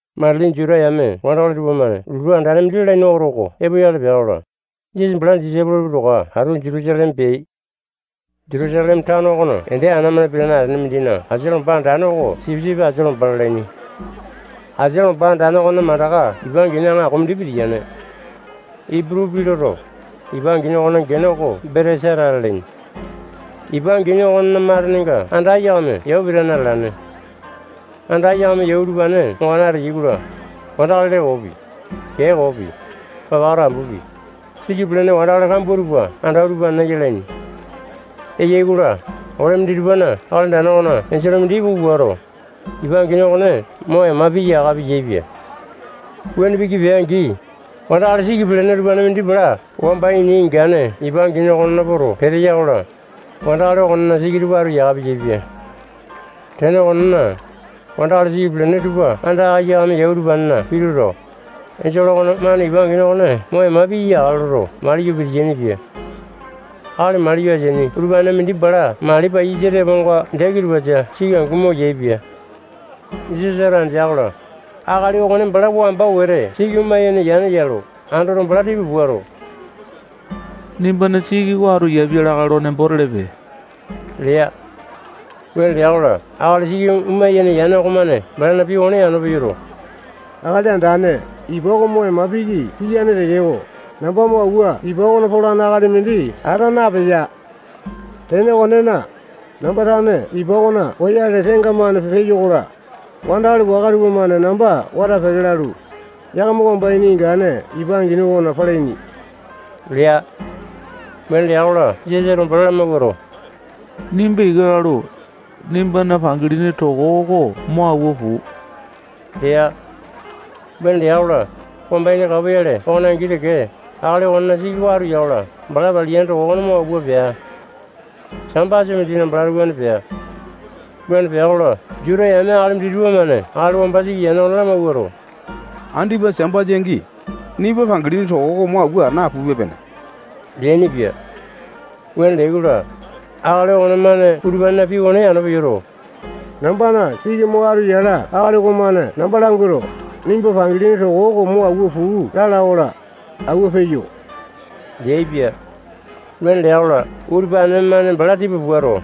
Matili Juta yame wandakali tupamane lotu andane mindi lalaini oto oko epoyale pea-kola, Jisasa balana disaipolo tupa towa atu Jutusaleme peai. Jutusaleme tano okona ende ana-mane pitane atene mindina asia lomba andane oko Sipisipi Asia Lomba lalaini. Asia lomba andane okonena mandaka ipa angini aŋako mindi pitiyane. Iputu pii loto, ipa angini okonena gene oko Betesata lalaini. Ipa angini okonena matenenga anda aiyakame yau pitane atalane. Anda aiyakame yau utupane ongane ateyai-kola, wandakali lee koopi, kee koopi, papaka tambupi, siki pelene wandakali kambua tupa anda utupanena yalaini. [Eyai-kola, ole minditupana Akali Andane okona enjole mindi ipuku puato, ipa angini okone mo ema piya yaka piyaepia. Wuane piki pea-angi, wandakali siki pelene utupanena mindi bala wamba ini ingane ipa angini okonena poto peteya-kola, wandakali okonena siki tupa atu yaka piyaepia. Tene okonena, wandakali siki pelene tupa anda aiyakame yau utupanena pituto, enjole okonemane ipa angini okone mo ema piya yakale lo maliyo pitiyaini-pia.] Akali maliyo ateaini utupanena mindi bala mali paiyasa teponga dee kitupasa siki angu omo yaepia. Jisasato andea-kola, akali okone bala wamba wete siki omo yene yane ya lo andoto, bala tipa puato, nimbana siki oko atu yapia lakae lo nembo telepe lea. Wuane lea-kola, akali siki oma yene yane okomane balana pii okone yano peyoto, Akali Andane, ipa oko mo ema piki piyane tekeko, namba mo awua ipa okona polane akali mindi ata napeya. Tene okonena, namba tane ipa okona poyale tengamane peyo-kola, wandakali waka tupamane namba wata peke lalu, yakama wamba ini ingane ipa angini okona palaini lea. Wuane lea-kola, Jisasato bala lamawuato, nimba ika lalu, nimbana pangilini toko oko mo awua puu lea. Wuane lea-kola, wamba ini kapoyale okone angi teke, akali okonena siki oko atu ya-kola, bala paliyane toko okone mo awua pea. Sambasa mindina balato wuane pea. Wuane pea-kola, Juta yame akali minditupa-mane akali wamba siki yane okone lamawuato, andipa Sambasa angi, nimba pangilini toko oko mo awua napupe-pene leainipia. Wuane leai-kola, akali okonemane utupanena pii okone yano peyoto, nambana siki mo atu yala akali okomane namba languato, nimba pangilini toko oko mo awua puu lala-kola, awua peyo leaipia. Wuane lea-kola, utupane-mane bala tipa puato,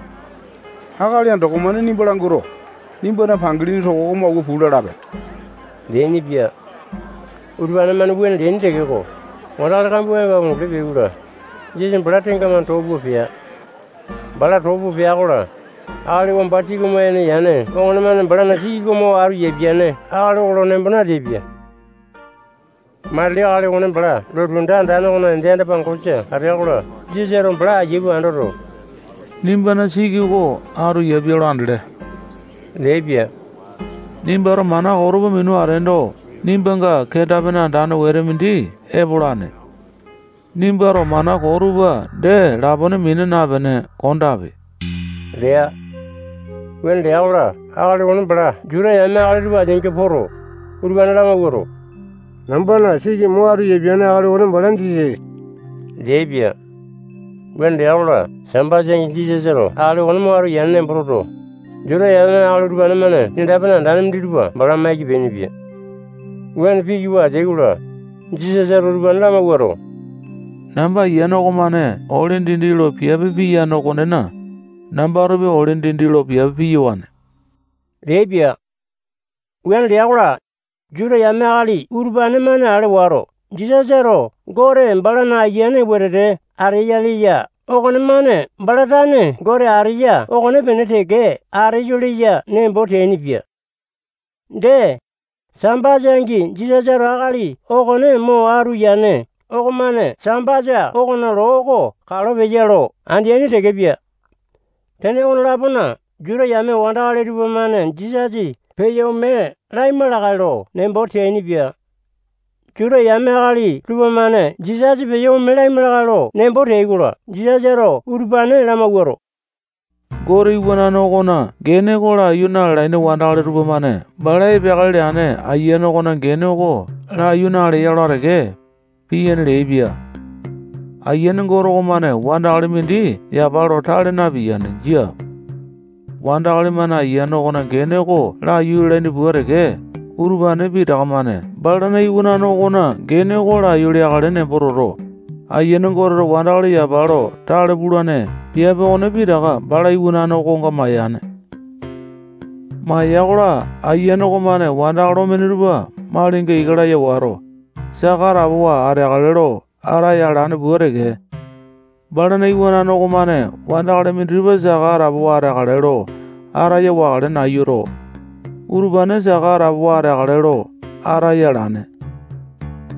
akali andoko-mane nimba languato, nimbana pangilini toko oko mo awua puu lalape leainipia. Utupane-mane wuane leaini tekeko, wandakali kambua epo amunguli peai-kola, Jisasa bala tengamane too pua pea. Bala too pua pea-kola, akali wamba siki oma yene yane okonemane balana siki oko mo atu yapiane akali oko nembo nateaipia. Matili akali okone bala lotu anda andane okona ende anda-pangosa atea-kola, Jisasato bala aiya pua andoto, nimbana siki oko atu yapia lo andele leaipia. Nimbato mana koo tupa minu ateendo, nimbanga kenda-pene andane wete mindi epolane. Nimbato mana koo tupa dee lapone mina napene kondape lea. Wuane lea-kola, akali okone bala Juta yame akali tupa ateainga poto, utupane lamawuato, nambana siki mo atu yapiane akali okone bala Jisasa leaipia. Wuane lea-kola, Sambasa angi Jisasato akali okone mo atu yane nembo toto, Juta yame akali utupane-mane kenda-pene andane minditupa bala maiki peainipia. Wuane piki pua ateai-kola, Jisasato utupane lamawuato, namba Ayiane okomane ole dindi lo piape piyane okonena, nambatopi ole dindi lo piape piyawane leaipia. Wuane lea-kola, Juta yame akali utupane-mane ale wato, Jisasato Gote balana Ayiane wetete ateya leya okonemane bala tane Gote ateya okonepene teke ateyo leya nembo teainipia. Dee, Sambasa angi Jisasato akali okone mo atu yane okomane Sambasa okona loo oko kalo peya lo andeaini tekepia. Tene okone-lapona, Juta yame wandakali tupamane Jisasa peyo ome laima lakae lo nembo teainipia. Juta yame akali tupamane Jisasa peyo ome laima lakae lo nembo teai-kola, Jisasato utupane lamawuato, Gote Iwanane okona gene oko laiyu na-lalaini wandakali tupamane bala epeakale leane Ayiane okona gene oko laiyu naleya-kola teke, piyane leaipia. Ayiane Gote okomane wandakali mindi yapa lo tale napiyane. Jia. Wandakali-mane Ayiane okona gene oko laiyu lalaini pua teke, utupane pitaka-mane balana Iwanane okona gene oko laiyu leakale nembo toto, Ayiane Goteto wandakali yapa lo tale pulane piape okone pitaka bala iwanane okonga mayane. Maya-kola, Ayiane okomane wandakali omene tupa malinga ika laya wato, saka atapowa ateakale lo ataya alane pua teke, balana Iwanane okomane wandakali minditupa saka atapowa ateakale lo ataya wakale nayuto, utupane saka atapowa ateakale lo ataya alane.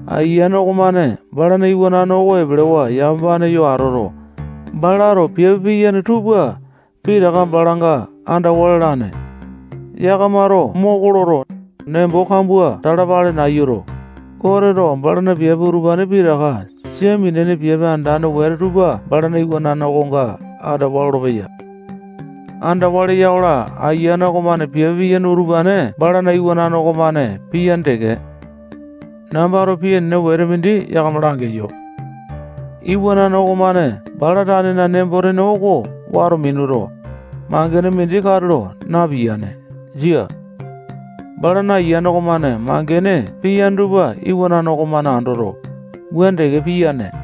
Ayiane okomane balana Iwanane oko epelewa yamapane yo atoto, balato piape piyane tupa pitaka balanga andawa lalane. Yakamato moko loto, nembo kambua talapale nayuto, Goteto balana piape utupane pitaka sia minene piape andane wete tupa balana iwanane okonga andawa lolopeya. Andawa leya-kola, Ayiane okomane piape piyane utupane balana iwanane okomane piyane teke. Nambato pii enene wete mindi yakama langeyo. Iwanane okomane bala tanena nembo-tene oko wato minuto, mangene mindi katulo napiyane. Jia. Balana Ayiane okomane mangene piyane tupa iwanane okomane andoto, wuane teke piyane.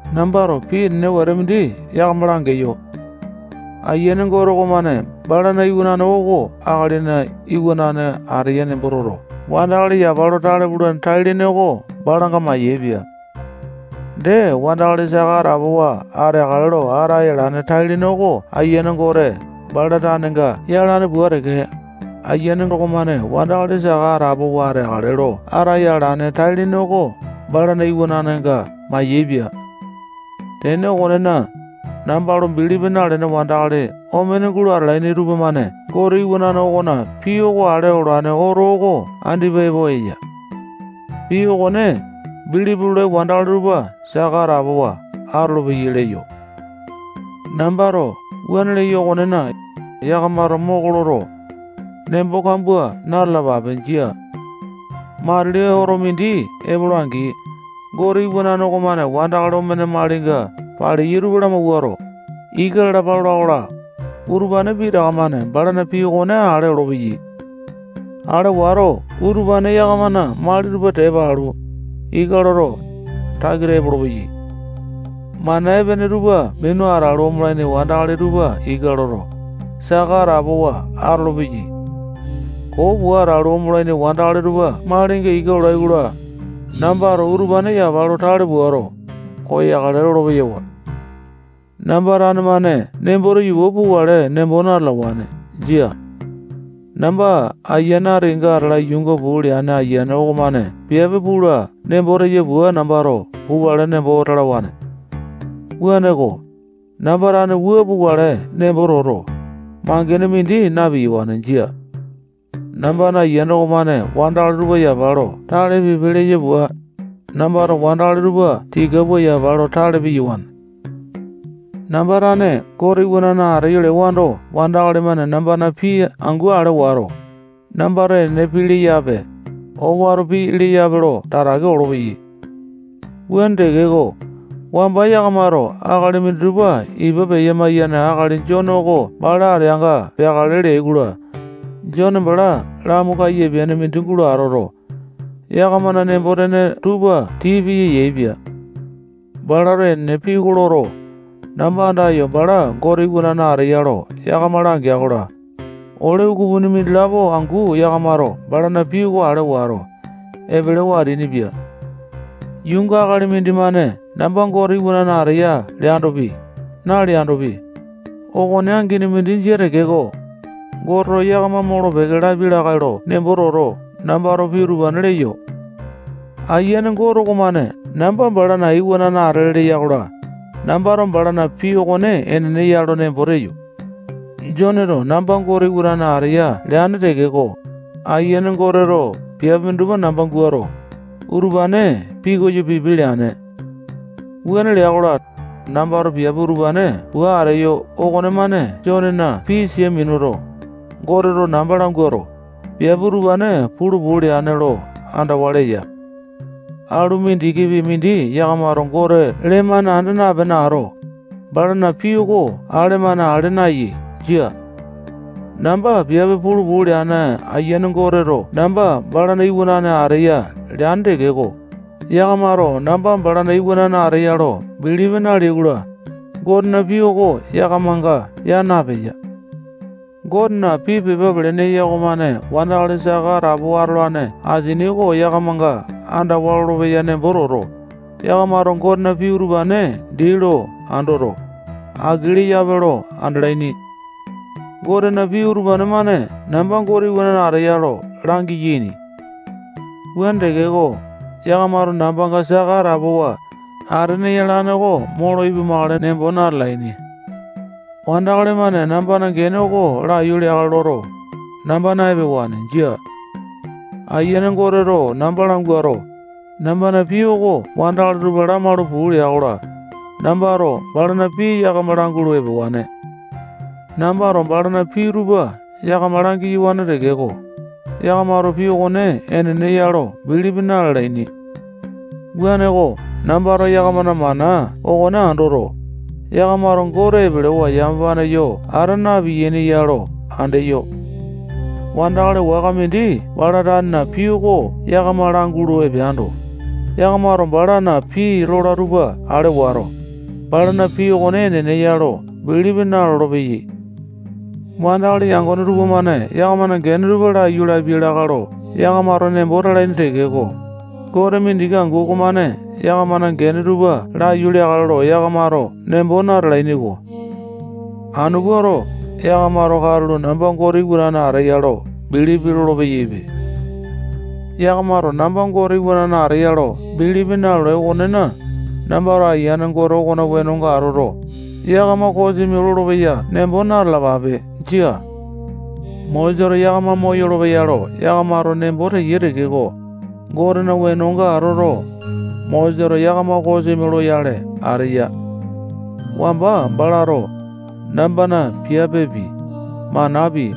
Nambato pii enene wete mindi yakama langeyo. Ayiane Gote okomane balana iwanane oko Akalina Iwanane ateya nembo toto, wandakali yapa lo tale pulane tai-lene oko balanga mayaepia. Dee, wandakali saka atapowa ateakale lo ataya alane tai-lene oko Ayiane Gote bala tanenga yalane pua teke, Ayiane okomane wandakali saka atapowa ateakale lo ataya alane tai-lene oko balana iwananenga mayaepia. Tene okonena, namba lo bilipi nalene wandakali omene gulo atalaini tupamane Gote Iwanane okona pii oko ale olane oto oko andipa epo eya. Pii okone bilipi lolai wandakali tupa, saka atapowa atolopeyai leyo. Nambato wuane leyo okonena, yakamato moko loto, nembo kambua na-talapape. Jia. Matili oto mindi epola-angi, Gote Iwanane okomane wandakali omene malinga paleyai tupa lamawuato, ika lalapa lola-kola, utupane pitaka-mane balana pii okone ale olopeyai. Ale wato, utupane yakamana mali tupa tepa alu, ika loto, takita epolopeyai. Mana epene tupa minu atalu, omolaini wandakali tupa ika loto, saka atapowa atolopeyai. Koo pua atalu, omolaini wandakali tupa malinga ika lolai-kola, nambato utupane yapa lo tale puato, koyakale lolo-peyawa. Namba tane-mane nembo teyo pua pukale nembo natalawane. Jia. Namba ati kenga atala yuunga puu leane Ayiane okomane piape pula nembo teya pua nambato pukale nembo talawane. Wuaneko, namba tane wua pukale nembo toto, mangene mindi na-piyawane. Jia. Nambana Ayiane okomane wandakali tupa yapa lo tale pipe leya pua, nambato wandakali tupa tika pua yapa lo tale piyawane. Namba tane Gote Iwanane ateyo lewando, wandakali-mane nambana pii angu ale wato, nambato enene pii leyape, owato pii leyape lo tatake olopeyai. Wuane tekeko, wamba yakamato akali minditupa ipa peya-maiyane akali Jone oko bala ateanga peakale leai-kola, Jone bala lamu kaiyapiane mindi gulo atoto, yakamana nembo-tene tupa tii piya yaepia. Balato enene pii oko loto, namba andayo, bala Gote Iwanane ateya lo yakama langea-kola, ole ukupini mindilapo angu yakamato balana pii oko ale wato, epelewa ateainipia. Yuunga akali mindimane namba Gote Iwanane ateya leandopi, naleandopi, okone angini mindi jia tekeko, Goteto yakama molo-peke lapia lakae lo nembo toto, nambato pii utupane leyo. Ayiane Gote okomane namba balana Iwanane atele leya-kola, nambato balana pii okone enene ya lo nembo teyo. Joneto namba Gote Iwanane ateya leane tekeko, Ayiane Goteto piape minditupa namba guato, utupane pikoyo pipe leane. Wuane lea-kola, nambato piape utupane pua ateyo okonemane Jonena pii sia minuto, Goteto namba languato, piape utupane pulu puu leane lo andawa leya. Alu mindikipi mindi yakamato Gote lee-mane anda napene ato, balana pii oko ale-mane ale nayai. Jia. Namba piape pulu puu leane Ayiane Goteto namba balana Iwanane ateya leane tekeko, yakamato namba balana Iwanane ateya lo bilipi naleai-kola, Gotena pii oko yakamanga yaa napeya. Gotena pii pepa pelene eya okomane wandakali saka atapowa atolane asini oko yakamanga andawa lolopeya nembo toto, yakamato Gotena pii utupane dii lo andoto, aki leyape lo andalaini. Gotena pii utupane-mane namba Gote Iwanane ateya lo langiyaini. Wuane tekeko, yakamato nambanga saka atapowa atene yalane oko molo ipumakale nembo natalaini. Wandakali-mane nambana gene oko laiyu leakale loto, namba na-epewane. Jia. Ayiane Goteto namba languato, nambana pii oko wandakali tupa lamaulu puu lea-kola, nambato balana pii yakama langulu epewane. Nambato balana pii tupa yakama langiyawane tekeko, yakamato pii okone enene ya lo bilipi na-lalaini. Wuaneko, nambato yakamana mana okone andoto, yakamato Gote epelewa yamapane yo ata na-piyaini ya lo andeyo. Wandakali waka mindi bala tanena pii oko yakama langulu epeando, yakamato balana pii lola tupa ale wato, balana pii okone enene ya lo bilipi nalolo-peyai. Wandakali yangone tupamane yakamana gene tupa laiyu lapiai lakae lo yakamato nembo talaini tekeko, Gote mindiki angu okomane yakamana gene tupa laiyu leakale lo yakamato nembo natalaini-ko. Anu puato, yakamato katulo namba Gote Iwanane ateya lo bilipi lolo-peyaipe. Yakamato namba Gote Iwanane ateya lo bilipi nalolai okonena, nambato Ayiane Gote okona wenonga atoto, yakama kosimi lolopeya nembo na-talapape. Jia. Mosesato yakama moyolo-peya lo yakamato nembo teyai tekeko, Gotena wenonga atoto, Mosesato yakama kosimi loyale ateya. Wamba balato nambana piapepi, manapi,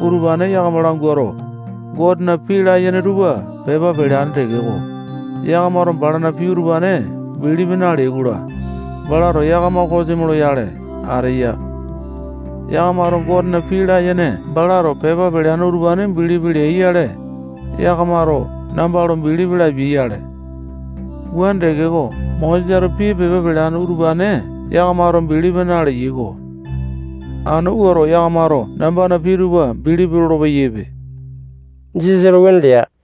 utupane yakama languato, Gotena pii layene tupa pepa peleane tekeko, yakamato balana pii utupane bilipi naleyai-kola, balato yakama kosimi loyale ateya. Yakamato Gotena pii layene balato pepa peleane utupane bilipi leai-yale, yakamato namba lo bilipi lapiai-yale. Wuane tekeko, Mosesato pii pepa peleane utupane yakamato bilipi naleyai-ko. Anu puato, yakamato nambana pii tupa bilipi lolo-peyaipe. Jisasato wuane lea.